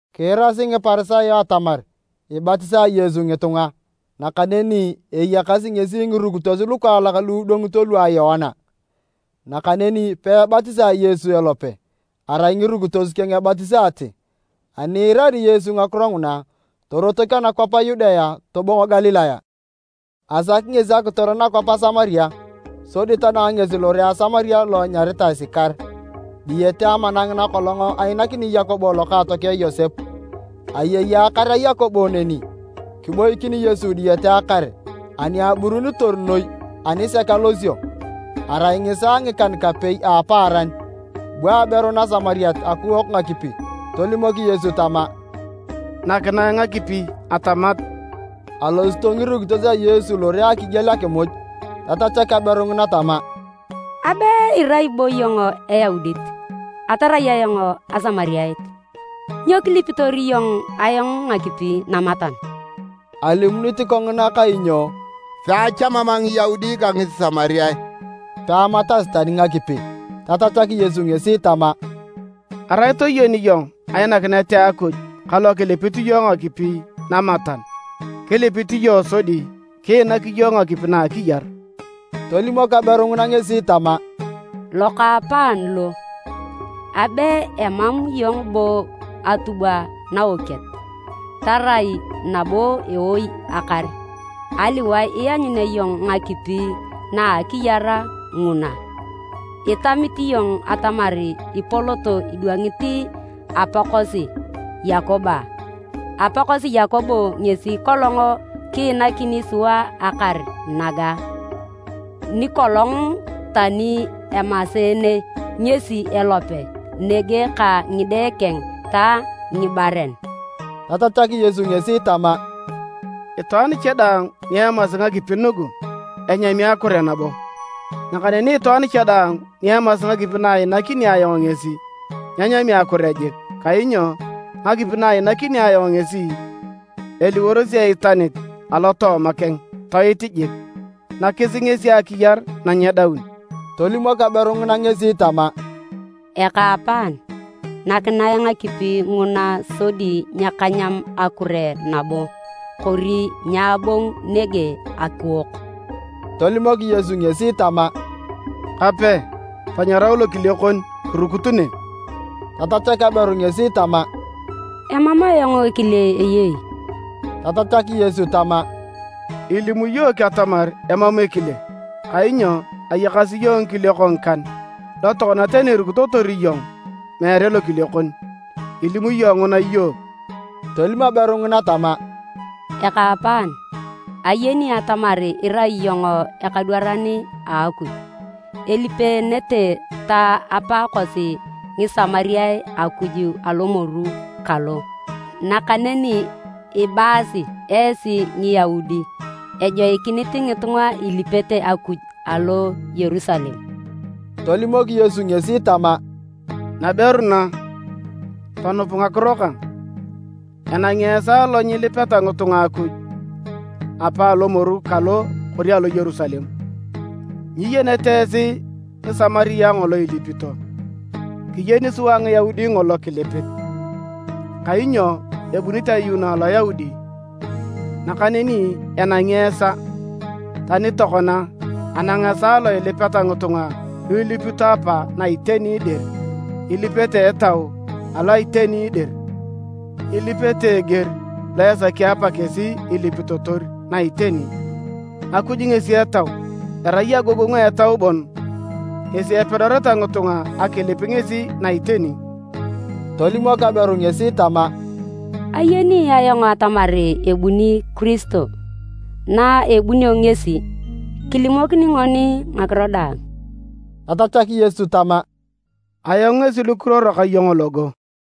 Kiirasi Ngiparisayo atamar ibatisae Yesu ngitunga, nakaneni eyakasi ngesi ngirukitos lukaalak lu idwangito lua Yoana. ( Nakaneni peebatisae Yesu elope, arai ngirukitos keng ebatisaate.) Ani iirari Yesu ngakiro nguna, torotok anakwap a Yudea tobongo Galilaya, asaki ngesi akitor nakwap a Samaria. Sodi tanang ngesi lore a Samaria lo enyaritae Sikar, diyete amana ngina kolong ainakinit Yakobo lokookeng Yosep. Ayei akar a Yakobo neni. Kiboikin Yesu diyete akar ani aburunitor noi anisek alosio. Arai ngisaa ngikan-kapei a apaaran. Bu aberu Nasamariat akuok ngakipi. Tolimok Yesu tama, “Nakinae ngakipi atamat.” ( Alosito ngirukitos a Yesu lore akigiel akimuj.) Tatachak aberu ngina tama, “Abe irai bo iyong Eyaudit, atarai ayong Asamariat, nyo kilipitor iyong ayong ngakipi namatan?” (Alimunit kongina kainyo peachamam Ngiyaudi ka Ngisamariae peamatasi tani ngakipi.) Tatachak Yesu ngesi tama, “Arai toyeni iyong ainakinet a Akuj ka lo kilipit iyong ngakipi namatan, kilipit iyong sodi kiinak iyong ngakipi na a akiyar.” Tolimok aberu ngina ngesi tama, “Lokaapaan lo, abe emam iyong bo atubwa naokiet, tarai nabo ewoi akar. Aliwae ianyunea iyong ngakipi na a akiyar nguna? Itamit iyong atamar ipolot idwangit apaakosi Yakobo a? Apaakosi Yakobo ngesi kolong kiinakini sua akar naga, nikolong tani amaseene ngesi elope nege ka ngide keng ta ngibaren.” Tatachak Yesu ngesi tama, “Itwaan cha daang ni emasi ngakipi nugu, enyami akure nabo, nakaneni itwaan cha daang ni emasi ngakipi na iinakini ayong ngesi, nyenyami akure jik, kainyo ngakipi na iinakini ayong ngesi eliworosi eitanit alotooma keng toit jik, nakis ngesi akiyar na nyedaun.” Tolimok aberu ngina ngesi tama, “Ekaapaan, nakinae ngakipi nguna sodi nyakanyam akure nabo, kori nyaabongu nege akuok.” Tolimok Yesu ngesi tama, “Kape, tanyarau lokile kon kirukut nege.” Tatachak aberu ngesi tama, “Emam ayong ekile eyei.” Tatachak Yesu tama, “Ilim iyook atamar emam ekile, kainyo ayakasi iyong ngikiliok ngikan, lo tokona tani irukitotor iyong meere lokile kon. Ilim iyong nguna iyook.” Tolim aberu ngina tama, “Ekaapaan, ayen atamar irai iyong ekadwaran a Akuj. Elipeenete ta apaakosi Ngisamariae Akuj alomoru kalo, nakaneni ibaasi esi Ngiyaudi ejoikinit ngitunga ilipete Akuj alo Yerusalem.” Tolimok Yesu ngesi tama, “Naberu na, tonup ngakiro kang, enangi esaa lo nyilipeta ngitunga Akuj Apa alomoru kalo kori alo Yerusalem. Nyiyenete esi Ngisamariae ngolo ilipito. Kiyeni sua Ngiyaudi ngolo kilipit, kainyo ebunit ayuuno Aloyaudi. Nakaneni enangi esaa, tani tokona anang esaa lo ilipeta ngitunga lu ilipito Apa na iteni dir, ilipete a Etau alo iteni dir. Ilipete eger lo esaki Apa kesi ilipitotor na iteni. Akuj ngesi Etau, erai agogongu a Etau bon ngesi epedoreta ngitunga akilip ngesi na iteni.” Tolimok aberu ngesi tama, “Ayeni ayong atamar ebuni Kiristo. Na ebunio ngesi, kilimokini ngoni ngakiro daang.” Tatachak Yesu tama, “Ayong ngesi lokiruoro ka iyong logo.”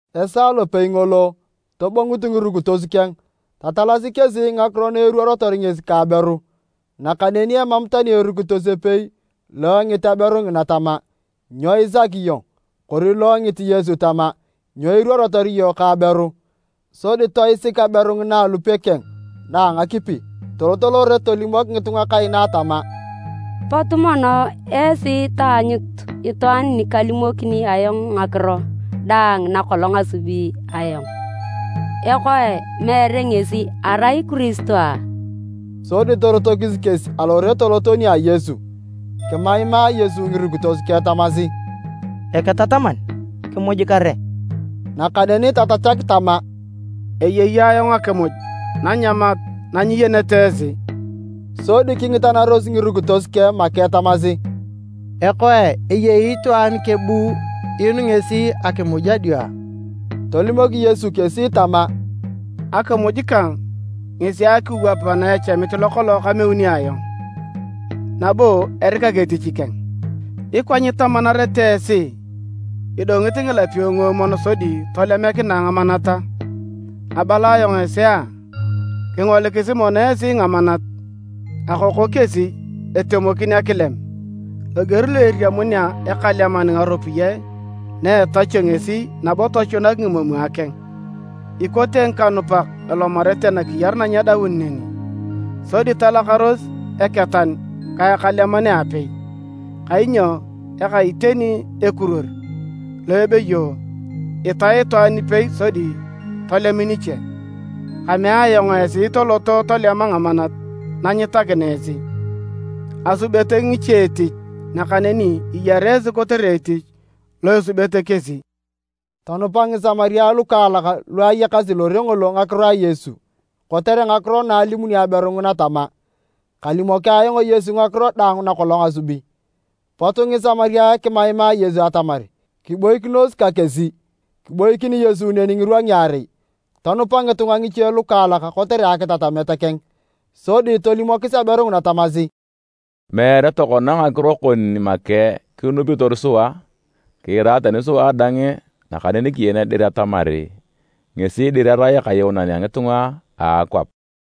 Esaa lopei ngolo tobongut ngirukitos keng, tatalasi kesi ngakiro na eruorotor ngesi ka aberu, nakaneni emam tani erukitos epei lo engit aberu ngina tama, “Nyo isaki iyong?” Kori lo engit Yesu tama, “Nyo iruorotor iyong ka aberu?” Sodi toisik aberu ngina alupe keng na a ngakipi, tolot lore tolimok ngitunga kaina tama, “Potu mono esi taanyutu itwaan nikalimokini ayong ngakiro daang nakolong asubi ayong. Ekoe, meere ngesi erai Kiristo a?” Sodi torotokis kesi alore toloto nia Yesu. Kimaimaa Yesu ngirukitos keng tamasi, “Eketataman, kimuj kare!” Nakaneni tatachak tama, “Eyei ayong akimuj nanyamat na nyiyenete esi.” Sodi kingitanaros ngirukitos keng make tamasi, “Ekoe! Eyei itwaan kebu inu ngesi akimuj adio a?” Tolimok Yesu kesi tama, “Akimuj kang ngesi akiwap naechamit lokolong kameuni ayong, nabo erikak etich keng. Ikwa nyitamanarete esi, ‘Idongit ngilapio nguomwon sodi tolemikinae ngamanat a?’ Abala ayong esi a! Kingolikisi mono esi ngamanat, akoko kesi etemokin akilem! Loger lo eriamunea ekaleman ngaropiyae na etachio ngesi nabo tochunak ngimomwa keng, ikote ngikanupak elomarete nakiyar na nyedaun neni, sodi talakaros eketan ka ekaleman aapei. Kainyo eka iteni ekiruor lo ebeyo, ‘Itae itwaan ipei sodi tolem niche.’ Kamea ayong esi toloto tolema ngamanat na nyitakina esi, asubete ngiche etich nakaneni iyara esi kotere etich lo esubete kesi.” Tonupa Ngisamariae lukaalak luayakasi lore ngolo ngakiro a Yesu kotere ngakiro na alimuni aberu ngina tama, “Kalimoki ayong Yesu ngakiro daang nakolong asubi.” Pot Ngisamariae kimaimaa Yesu atamar kiboikinos ka kesi, kiboikin Yesu neni ngirwa ngiarei. Tonupa ngitunga ngiche lukaalak kotere akitatamet keng, sodi tolimokis aberu tamasi, “Meere tokona ngakiro kon make kinupitor sua, kiira tani sua dang, nakaneni kiyen dir atamar ngesi dir erai Ekayuunan a ngitunga a akwap.”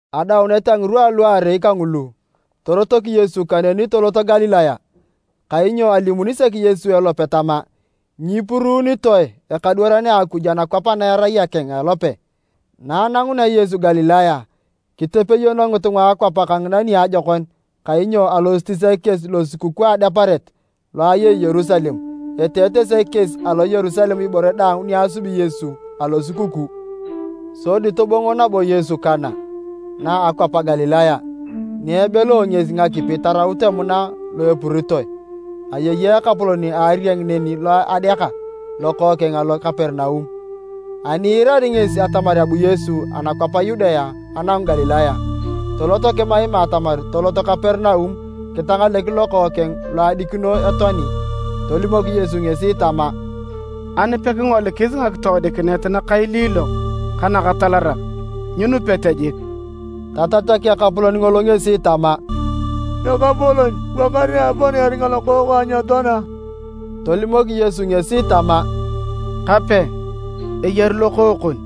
Adaunet a ngirwa aluarei kangulu, torotok Yesu kaneni tolot Galilaya. Kainyo alimuni sek Yesu elope tama, “Nyipuruunitoe ekadwaran a Akuj anakwap ana erai akeng a elope.” Na anangunea Yesu Galilaya, kitepeyono ngitunga a akwap kangina niajokon kainyo alosito sek kesi Losukukuu a Adeparet, lo ayei Yerusalem. Eteete sek kesi alo Yerusalem ibore daang niasubi Yesu alosukukuu. Sodi tobongo nabo Yesu Kana, na a akwap a Galilaya, ni ebeleo ngesi ngakipi taraut emuna lo epuritoe. Ayei ekapolon a arieng neni lo adeaka lokookeng alo Kaperinaum. Ani iirari ngesi atamar abu Yesu anakwap a Yudea anangu Galilaya, tolot kimaima atamar tolot Kaperinaum kitangalek lokookeng lo adikino etoani. Tolimok Yesu ngesi tama, “Ani pekingolikis ngakitoodikinet nakailiilok ka nakatalarak, nyinupete jik.” Tatachak ekapolon ngolo ngesi tama, “Ekapolon, bua kare apana eringa lokookang nyetoana.” Tolimok Yesu ngesi tama, “Kape, eyari lokookon!”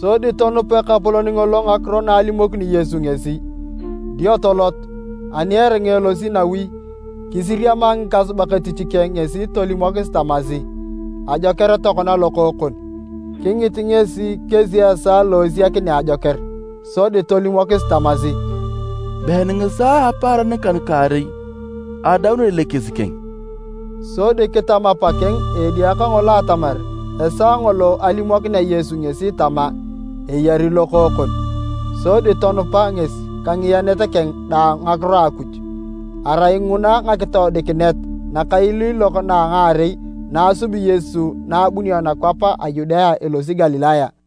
Sodi tonup ekapolon ngolo ngakiro na alimokini Yesu ngesi, dio tolot. Ani eringa elosi nawi, kisiriama ngikasubak etich keng ngesi tolimokis tamasi, “Ajoker tokona lokookon!” Kingit ngesi kesi esaa lo esiakinea ajoker. Sodi tolimokis tamasi, “Been ngisaa a apaaran ngikan-kaarei adaunor elekes keng.” Sodi kitam apakeng a edia kangolo atamar esaa ngolo alimokinea Yesu ngesi tama, “Eyari Lokookon.” Sodi tonupa ngesi ka ngiyenet keng daang ngakiro a Akuj. Arai nguna ngakitoodikinet nakailiilok na a ngaarei na asubi Yesu na abunio anakwap a Yudea elosi Galilaya.